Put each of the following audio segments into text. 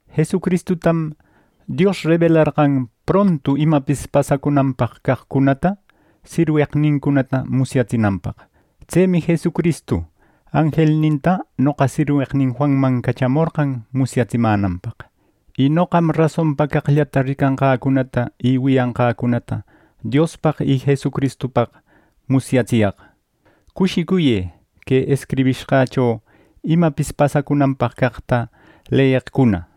Jesucristutam Dios rebelarqan prontu imapis pasacunanpaq caqcunata sirweqnincunata musyatsinanpaq. Tsemi Jesucristu anjelninta noqa sirweqnin Juanman cachamorqan musyatsimänanpaq. Y noqam rasonpa caqllata ricanqäcunata y wiyanqäcunata Diospaq y Jesucristupaq musyatsiyaq. Cushicuyë que escribishqächo imapis pasacunanpaq caqta leyeqcuna.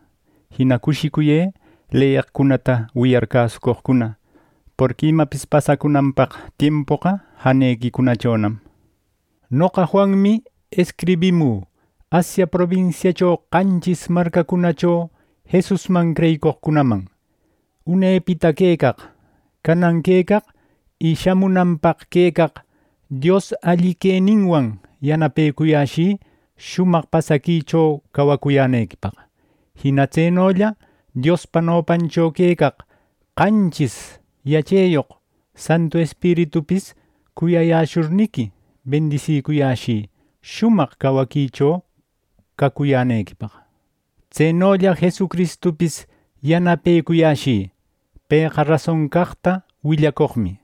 Jina cushicuyë leyeqcunata wiyar cäsucoqcuna. Porqui imapis pasacunanpaq tiempoqa janequicunachonam. Noqa Juanmi escribimü Asia probinsiacho qanchis marcacunacho Jesusman creyicoqcunaman. Unepita quecaq, canan quecaq y shamunanpaq quecaq Dios alli queninwan yanapecuyäshï shumaq pasaquicho cawacuyänequipaq. Jina tsenolla Diospa nopancho quecaq qanchis yacheyoq Santu Espiritupis cuyayäshurniqui, bendisicuyäshï shumaq cawaquicho cacuyänequipaq. Tsenolla Jesucristupis yanapecuyashï. Pëqa rason caqta willacoqmi.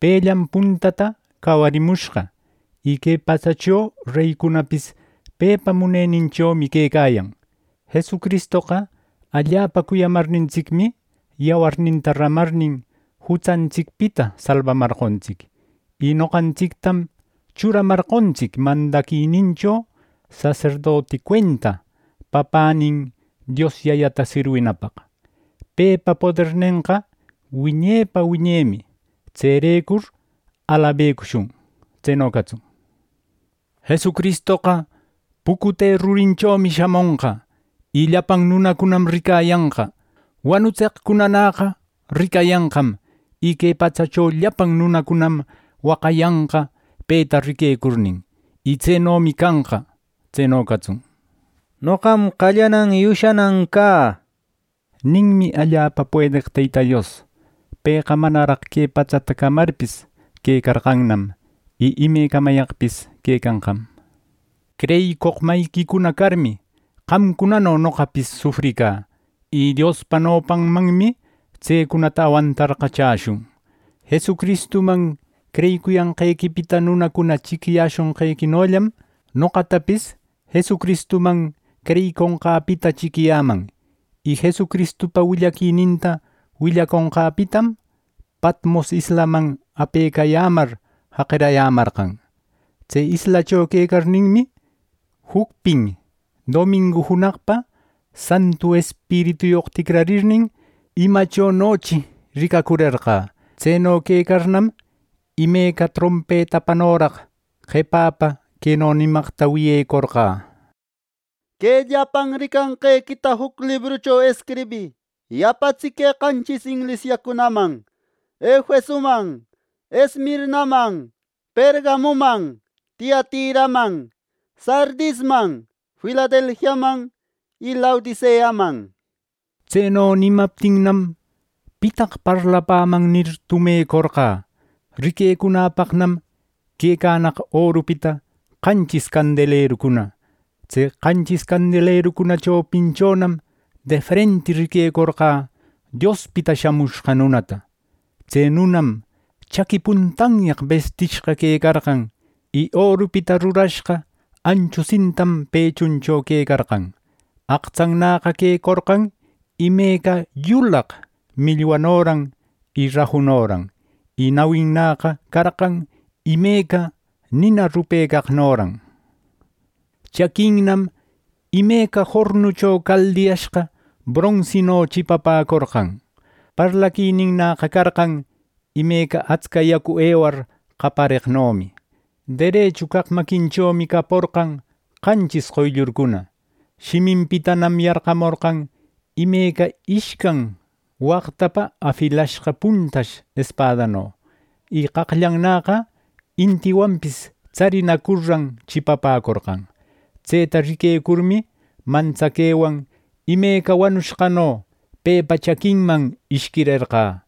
Pellam puntata cawarimushqa, y que patsacho reycunapis pepa muneninchomi quecayan. Jesucristoqa allapa cuyamarnintsicmi, yawarninta ramarnin jutsantsicpita salbamarqontsic. Y noqantsictam churamarqontsic mandaquinincho saserdoti cuenta papänin Dios Yayata sirwinapaq. Pepa podernenqa wiñepa wiñemi. Tserecur alabecushun. Tseno catsun. ¡Jesucristoqa pucute rurinchomi shamonqa! Y llapan nunacunam ricayanqa. Wanutseqcunanäqa ricayanqam, y que patsacho llapan nunacunam waqayanqa peta riquecurnin. Y tsenomi canqa ¡Tseno catsun! “Noqam qallanan y ushanan ca” ninmi allapa puedeq Teyta Dios. Pëqa manaraq que patsata camarpis, quecarqannam, y ime camayaqpis quecanqam. Creyicoq mayiquicuna carmi, qamcunano noqapis sufricä, y Diospa nopanmanmi tsecunata awantarqa chäshun. Jesucristuman creyicuyanqequipita nunacuna chiquiyäshonqequinollam noqatapis Jesucristuman creyiconqäpita chiquiyäman. Y Jesucristupa willaquininta willaconqäpitam Patmos islaman apecayämar jaqirayämarqan. Tse islacho quecarninmi, jucpin domingu junaqpa Santu Espirituyoq ticrarirnin, imachonochi ricacurerqä. Tseno quecarnam, imeca trompetapanoraq qepapä queno nicamaqta wiyecorqä: “Que llapan ricanqequita juc librucho escribï y apatsï que qanchis inglisiacunaman: Efesoman, Esmirnaman, Pergamoman, Tiatiraman, Sardisman Filadelfiaman y Laodiceaman” nir. Tseno nimaptinnam, “¿Pitaq parlapäman?” nir, tumecorqä. Riquecunäpaqnam quecanaq orupita qanchis candelerucuna. Tse qanchis candelerucuna chopinchonam defrenti riquecorqä Diospita Shamushqa Nunata. Tse nunam chaqui puntanyaq bistishqa quecarqan, y orupita rurashqa anchu sintatam pechuncho quecarqan. Aqtsannäqa quecorqan imeca yulaq millwanoran y rajunoran, y nawinnäqa carqan imeca nina rupecaqnoran. Chaquinnam imeca jornucho caldiyashqa bronsino chipapäcorqan. Parlaquininnäqa carqan imeca atsca yacu ewar qapareqnomi. Derechu caq maquinchomi caporqan qanchis qoyllurcuna. Shiminpitanam yarqamorqan imeca ishcan waqtapa afilashqa puntash espadano. Y qaqllannäqa intiwanpis tsarinacurran chipapäcorqan. Tseta riquecurmi, mantsaquewan imeca wanushqano pepa chaquinman ishquirerqä.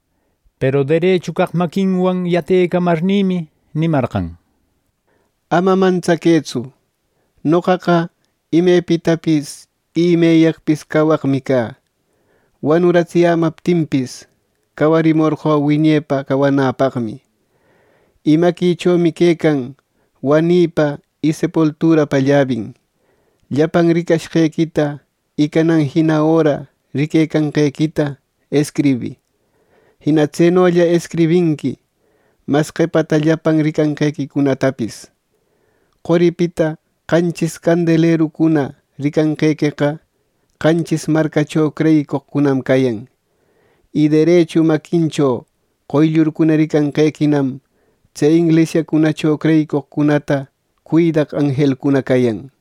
Peru derechu caq maquinwan yatecamarnïmi nimarqan: “Ama mantsaquëtsu; noqaqa imepitapis y imeyaqpis cawaqmi cä. Wanuratsiyämaptinpis, cawarimorqö wiñepa cawanäpaqmi, y maquïchomi quecan wanïpa y sepulturapa llabin. Llapan ricashqequita y canan jina öra riquecanqequita escribï. Jina tsenolla escribinqui mas qepata llapan ricanqequicunatapis. Qoripita qanchis candelerucuna ricanqequeqa qanchis marcacho creyicoqcunam cayan. Y derechu maquincho qoyllurcuna ricanqequinam tse inglisiacunacho creyicoqcunata cuidaq anjelcuna cayan” nir.